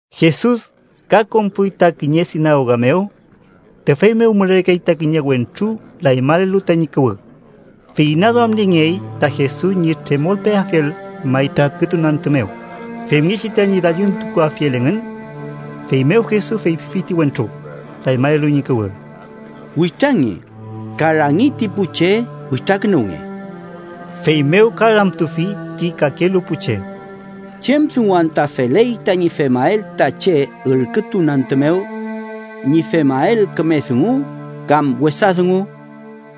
Jesus ka konpuy ta kiñe sinagoga mew. Tüfey mew mülerkey ta kiñe wentru lañmalelu tañi kuwü. Fey inaduamniengey ta Jesus ñi tremolpeafiel may ta ürkütun antü mew, femngechi tañi dalluntukuafiel engün. Feymew Jesus feypifi ti wentru, lañmalelu ñi kuwü: —Witrange, ka rangi ti pu che witrakünuwnge. Feymew ka ramtufi ti kakelu pu che: —¿Chem dungu anta feley tañi femael ta che ürkütun antü mew: ñi femael küme dungu kam wesa dungu?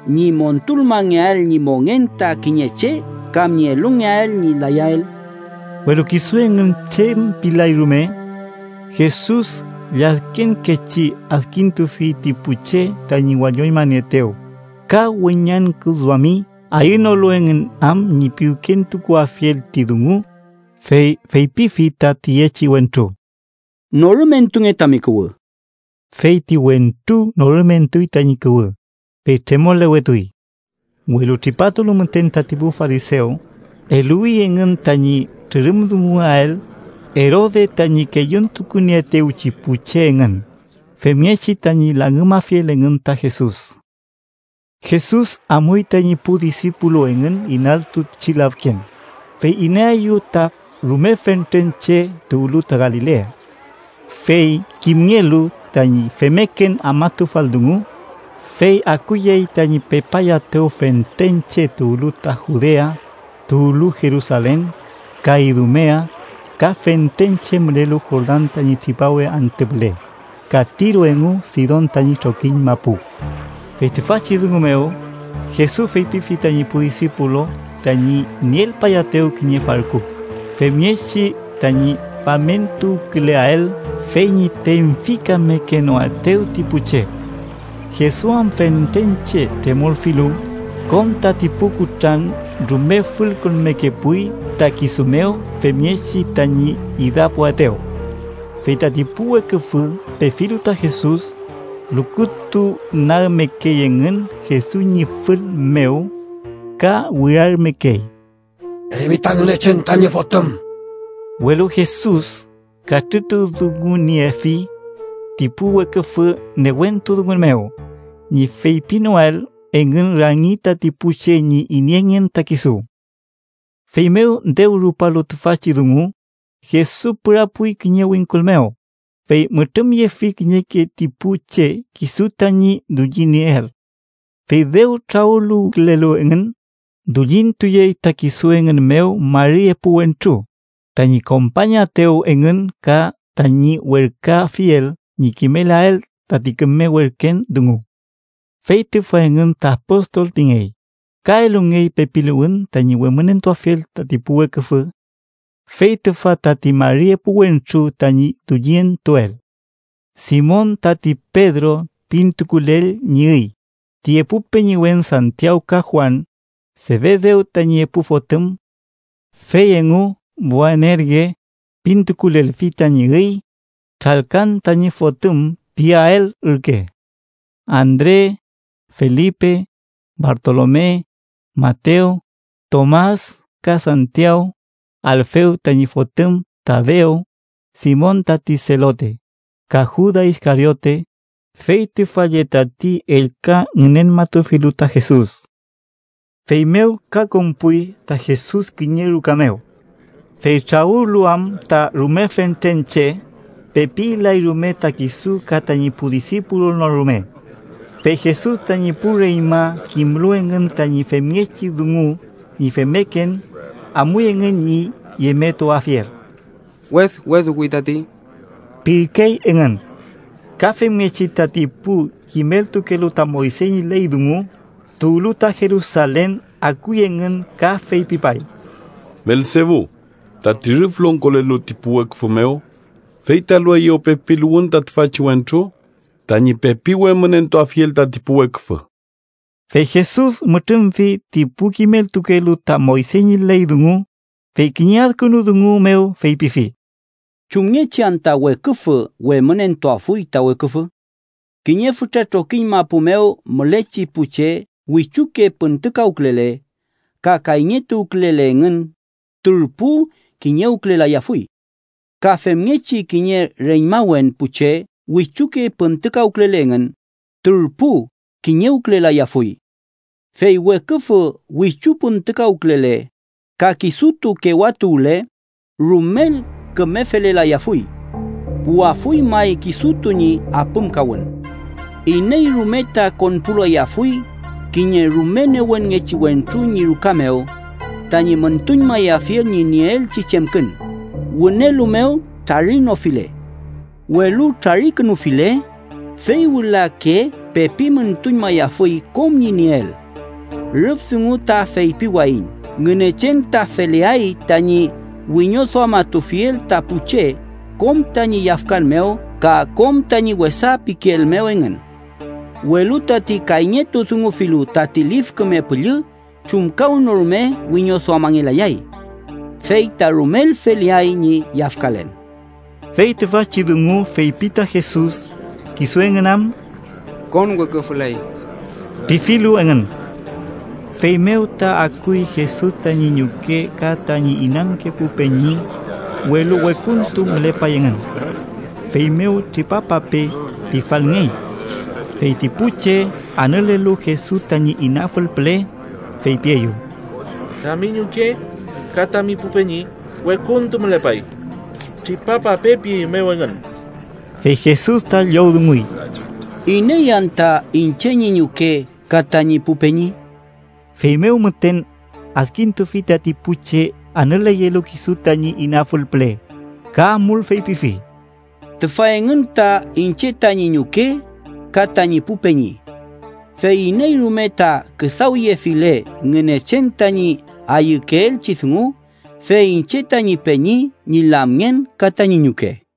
¿Ñi montulmangeael ñi mongen ta kiñe che kam ñi elungeael ñi layael? Welu kisu engün chem pilay rume. Jesus lladkenkechi adkintufi ti pu che tañi walloñmanieetew, ka weñangküduami ayünolu engün am ñi piwkentukuafiel ti dungu, fey feypifi ta tiyechi wentru: —Norümentunge tami kuwü. Fey ti wentru norümentuy tañi kuwü, fey tremolewetuy. Welu tripatulu müten tati pu farisew, eluwi engün tañi trürümdunguael Erode tañi kelluntukunieetewchi pu che engün femngechi tañi langümafiel engün ta Jesus. Jesus amuy tañi pu disipulu engün inaltu pichi lafken, fey inaeyew ta rume fentren che tuwlu ta Galilea. Fey kimngelu ñi femken afmatufal dungu, fey akuyey tañi pepayaetew fentren che tuwlu ta Judea, tuwlu Jerusalen, ka Idumea, ka fentren che mülelu Jordan tañi tripawe antü püle ka Tiro engu Sidon tañi trokiñ mapu. Fey tüfachi dungu mew, Jesus feypifi tañi pu disipulu tañi nielpayaetew kiñe farku, femngechi tañi famentuwküleael fey ñi tenfikamekenoaetew ti pu che. Jesus am fentren che tremolfilu, kom tati pu kutran rume fülkonmekepuy ta kisu mew femngechi tañi idapuaetew. Fey tati pu weküfü pefilu ta Jesus, lukutunagmekey engün Jesus ñi fül mew ka wirarümekey: —¡Eymi ta Ngünechen tañi Fotüm! Welu Jesus katrütudunguniefi ti pu weküfü newentu dungun mew ñi feypinoael engün rangi tati pu che ñi ineyngen ta kisu. Feymew dew rupalu tüfachi dungu, Jesus pürapuy kiñe wingkul mew, fey mütrümyefi kiñeke ti pu che kisu tañi dullitunieel. Fey dew trawüluwkülelu engün, dullintuyey ta kisu engün mew mari epu wentru, tañi kompañaetew engün ka tañi werküafiel ñi kimelael tati küme werken dungu. Fey tüfa engün ta apostol pingey, ka elungey pepiluwün tañi wemünentuafiel tati pu weküfü. Fey tüfa tati mari epu wentru tañi dullintuel: Simon, tati Pedro pintukulel ñi üy, ti epu peñiwen Santiaw ka Juan, Sefedew tañi epu fotüm, fey engu Boanerge pintukulelfi tañi üy (tralkan tañi fotüm piael ürke) Andre, Felipe, Bartolome, Matew, Tomas ka Santiaw, Alfew tañi fotüm Tadew, Simon tati Selote, ka Juda Iskariote, fey tüfa lle tati ellka ngünenmatufilu ta Jesus. Feymew ka konpuy ta Jesus kiñe ruka mew. Fey trawülu am ta rume fentren che, pepi ilay rume ta kisu ka tañi pu disipulu no rume. Fey Jesus tañi pu reñma kimlu engün tañi femngechi dungu ñi femmeken, amuy engün ñi yemetuafiel. “Wedweduwi tati” pirkey engün. Ka femngechi tati pu kimeltukelu ta Moyse ñi ley dungu tuwlu ta Jerusalen akuy engün ka feypipay: “Belsebu, tati rüf longkolelu ti pu weküfü mew, fey ta elueyew pepiluwün ta tüfachi wentru tañi pepi wemünentuafiel tati pu weküfü.” Fey Jesus mütrümfi ti pu kimeltukelu ta Moyse ñi ley dungu, fey kiñe adkünu dungu mew feypifi: “¿Chumngechi anta weküfü wemünentuafuy ta weküfü? Kiñe fütra trokiñ mapu mew mülechi pu che wichuke püntükawkülele ka kayñetuwkülele engün turpu kiñewkülelayafuy. Ka femngechi kiñe reñmawen pu che wichuke püntükawkülele engün, turpu kiñewkülelayafuy. Fey weküfü wichu püntükawkülele, ka kisutu kewatuwle, rumel küme felelayafuy. Puwafuy may kisutu ñi apümkawün. “Iney rume ta konpulayafuy kiñe rume newenngechi wentru ñi ruka mew tañi müntuñmayafiel ñi nieelchi chemkün, wünelu mew trarinofile. Welu trarikünufile, fey wülake pepi müntuñmayafuy kom ñi nieel. “Rüf dungu ta feypiwayiñ Ngünechen ta feleay tañi wiñoduamatufiel ta pu che, kom tañi yafkan mew ka kom tañi wesa pikeel mew engün. Welu tati kayñetudungufilu tati Lif Küme Püllü, chumkawnorume wiñoduamangelayay. Fey ta rumel feleay ñi yafkalen.” Fey tüfachi dungu feypi ta Jesus, kisu engün am “konweküfüley” pifilu engün. Feymew ta akuy Jesus tañi ñuke ka tañi inanke pu peñi, welu wekuntu mülepay engün. Feymew “tripapape” pifalngey. Fey ti pu che, anülelu Jesus tañi inafül püle, feypieyew: —Tami ñuke, ka tami pu peñi wekuntu mülepay. ‘Tripapape’ pieymew engün. Fey Jesus ta llowdunguy: —¿Iney anta iñche ñi ñuke ka tañi pu peñi? Feymew müten, adkintufi tati pu che anüleyelu kisu tañi inafül püle, ka amul feypifi: —Tüfa engün ta iñche tañi ñuke, ka tañi pu peñi. Fey iney rume ta küdawyefile Ngünechen tañi ayükeelchi dungu, fey iñche tañi peñi, ñi lamngen ka tañi ñuke.